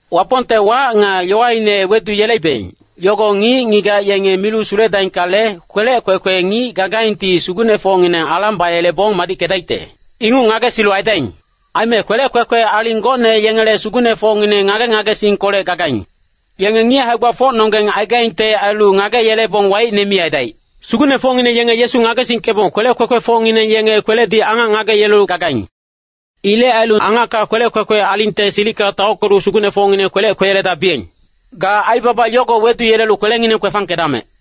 Wapongte wac nga yowaine weduyeleibeng, yogo ngic-ngigac yengi milu suledaingkale, kwelec kwekwe ngic gagaingti sugucnefocngineng alang bayelebong madickedaicte. Inguc ngagesilu aidaing. Aime kwelec kwekwe aling gocne yengele sugucnefocngineng ngage-ngagesingkolec gagaing. Yenge ngic hae-gbafocnonggeng aigaingte ailu ngageyelebong waicne mi aidaic. Sugucnefocngineng yenge Yesu ngagesingkebong kwelec kwekwefocngineng yenge kweledi angac ngageyelelu gagaing. Ilec ailu angacka kwelec kwekwe alingte silicka taockelu sugucnefocngineng kwelec kweyeledabiyeng. Ga aibaba yogo weduyelelu kwelengineng kwefangkedamec.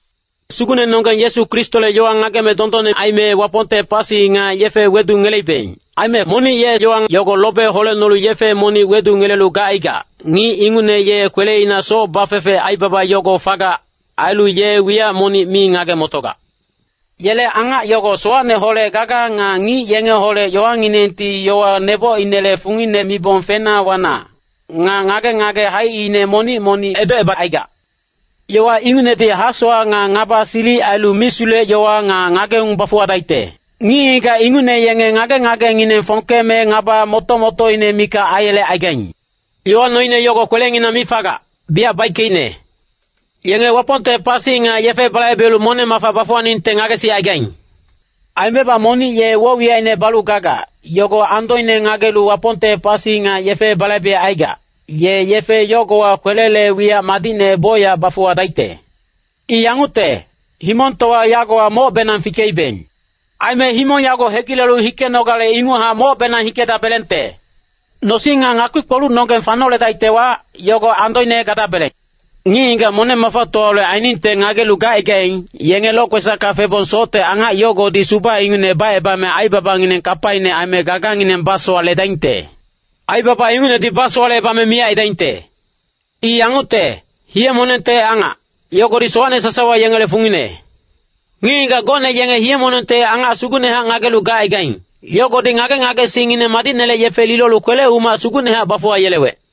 Sugucnenonggeng Yesu Kristole yowa ngagebeng dondonne aime Wapongte pasi nga yefe wedungeleibeng. Aime monic ye yowa yogo lobe holecnolu yefe monic wedungelelu gacaigac, ngic ingucne ye kweleina soc bafefe aibaba yogo fagac. Ailu ye wiyac monic mi ngage-motogac. Yele angac yogo sowacneholec gagac. Nga ngic yengeholec yowanginengti yowa nebocinele fungine mibong fena wana, nga ngage-ngage haicine monic-monic edocebacaigac. Yowa ingucnedi hasowac nga ngaba silic ailu misulec-yowa nga ngageung bafuwadaicte. Ngic-ngigac ingucne yenge ngage-ngagengineng fongkeme ngaba moto-motoine mikac aiyelecaigaing. Yowa noine yogo kwelenginang mi fagac, biyac baickeicne. Yenge Wapongte pasi nga yefe balaibelu moneng-mafa bafuwaningte ngagesicaigaing. Aimebac monic ye woc-wiyacine balu gagac, yogo andoine ngagelu Wapongte pasi nga yefe balaibecaigac, ye yefe yogowa kwelele wiyac madicne bocyac bafuwadaicte. I yangucte, himongtowa yagowa mocbenang fikeibeng. Aime himong yago hegilelu hikenogale inguchac mocbenang hikedabelengte. Nosing nga ngakpi-kpolucnonggeng fanoledaictewa, yogo andoine gadabeleng. Ngic-ngigac moneng-mafatowaholec ainingte ngagelu gacaigaing, yenge lokwesacka febong socte angac yogodi suba ingucne bacebame aibabangineng kapaine aime gagangineng basowaledaingte. Aibaba ingucnedi basowalecebame miyac aidaingte. I yangucte, hiye-monengte angac, yogodi sowacne sasawa yengele fungine. Ngic-ngigac gocne yenge hiye-monengte angac sugucnehac ngagelu gacaigaing, yogodi ngage-ngagesingngineng madicnele yefe lilolu kwele-umac sugucnehac bafuwayelewec.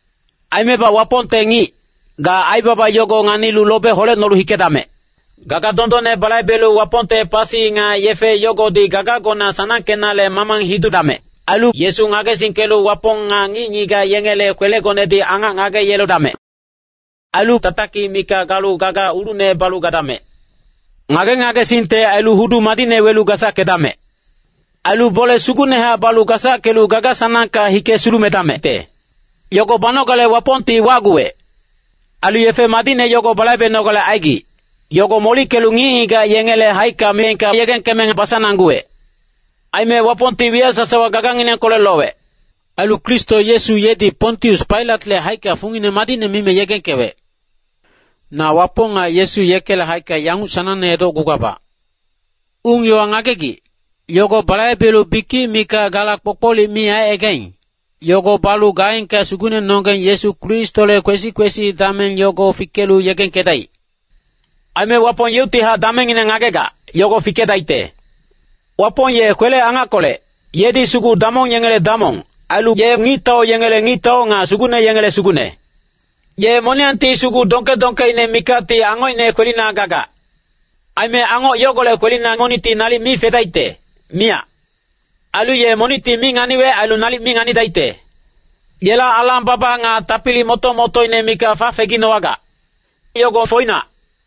Aimebac Wapongte ngic, ga aibaba yogo nganilu lobe holecnolu hikedamec. Gaga dondonne balaibelu Wapongte pasi nga yefe yogodi gagagona sanangkenale mamang hidudamec. Ailu Yesu ngagesingkelu Wapong nga ngic-ngigac yengele kwelegonedi angac ngageyeledamec. Ailu tatakic mikac galu gaga ulucne balu gadamec. Ngage-ngagesingte ailu hudu madicne welu gasackedamec. Ailu bole sugucnehac balu gasackelu gaga-sanangka hike sulumedamecte. Yogo banogale Wapongti wacguwec. Ailu yefe madicne yogo balaibenogale aigic, yogo molickelu ngic-ngigac yengele haicka miyengka yegengkeme basanangguwec. Aime Wapongti wiyac sasawa gaganginengkolec lowec. Ailu Kristo Yesu yedi Pontius Pailatle haicka fungine madicne mime yegengkewec. Na Wapong nga Yesu yekele haicka yanguc sanangne edocgugabac. Ung-yowa ngagegic, yogo balaibelu bikic mikac gala kpokpolic mi aicaigaing, yogo balu gaengka Sugucnenonggeng Yesu Kristole kwesi-kwesi dameng yogo fikelu yegengkedaic. Aime Wapong yeuctihac damengngine ngagegac, yogo fikedaicte. Wapong ye kwele-angackolec, yedi sugu damong yengele Damong, ailu ye ngictau yengele Ngictau nga sugucne yengele Sugucne. Ye moniyangti sugu dongke-dongkeine mikacti angocine kwelina gagac. Aime angoc yogolec kwelina monicti nalic mi fedaicte, miyac. Ailu ye monicti mi nganiwec ailu nalic mi nganidaicte. Yela alang-baba nga tapili moto-motoine mikac fafeginowagac. Yogo foinac.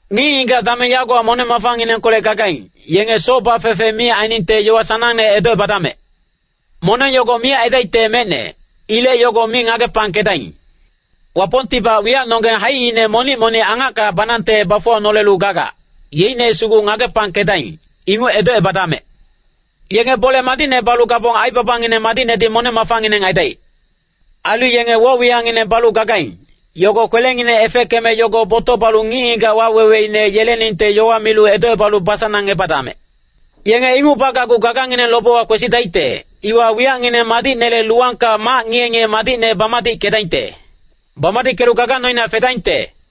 Ngic-ngigac dameng yagowa moneng-mafanginengkolec gagaing, yenge soc bafefe mi ainingte yowa sanangne edocebadamec. Moneng yogo miyac aidaicte mecne. Ilec yogo mi ngagepangkedaing. Wapongtibac wiyacnonggeng haicine monic-monic angacka banangte bafuwanolelu gagac, yeicne sugu ngagepangkedaing, inguc edocebadamec. Yenge bole madicne balu gabong aibabangineng madicnedi moneng-mafangineng aidaic. Ailu yenge woc-wiyacngineng balu gagaing, yogo kwelengineng efeckeme yogo botoc balu ngic-ngigac waweweine yeleningte yowa milu edocebalu basanangebadamec. Yenge inguc bagacgu gagangineng lobewa kwesidaicte, iwa wiyacngineng madicnele luwangka mac ngiye-ngiye madicne bamadickedaingte. Bamadickelu gaga noina fedaingte.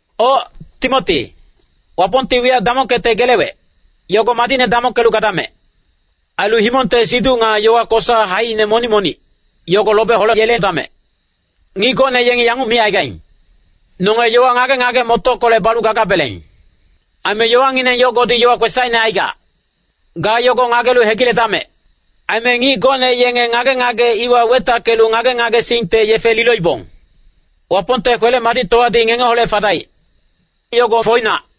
Oc, Timoti, Wapongti wiyac damongkecte gelewec, yogo madicne damongkelu gadamec. Ailu himongte siduc nga yowa kosa haicine monic-monic, yogo lobe holeyeledamec. Ngic gocne yengi yanguc micaigaing, “Nonge yowa ngage-ngage-motockolec balu gagabeleng.” Aime yowangineng yogodi yowa kwesacine aigac. Ga yogo ngagelu hegiledamec. Aime ngic gocne yenge ngage-ngage iwa wetackelu ngage-ngagesingte yefe liloibong. Wapongte kwele-madictowadi ngengeholec fadaic. Yogo foinac.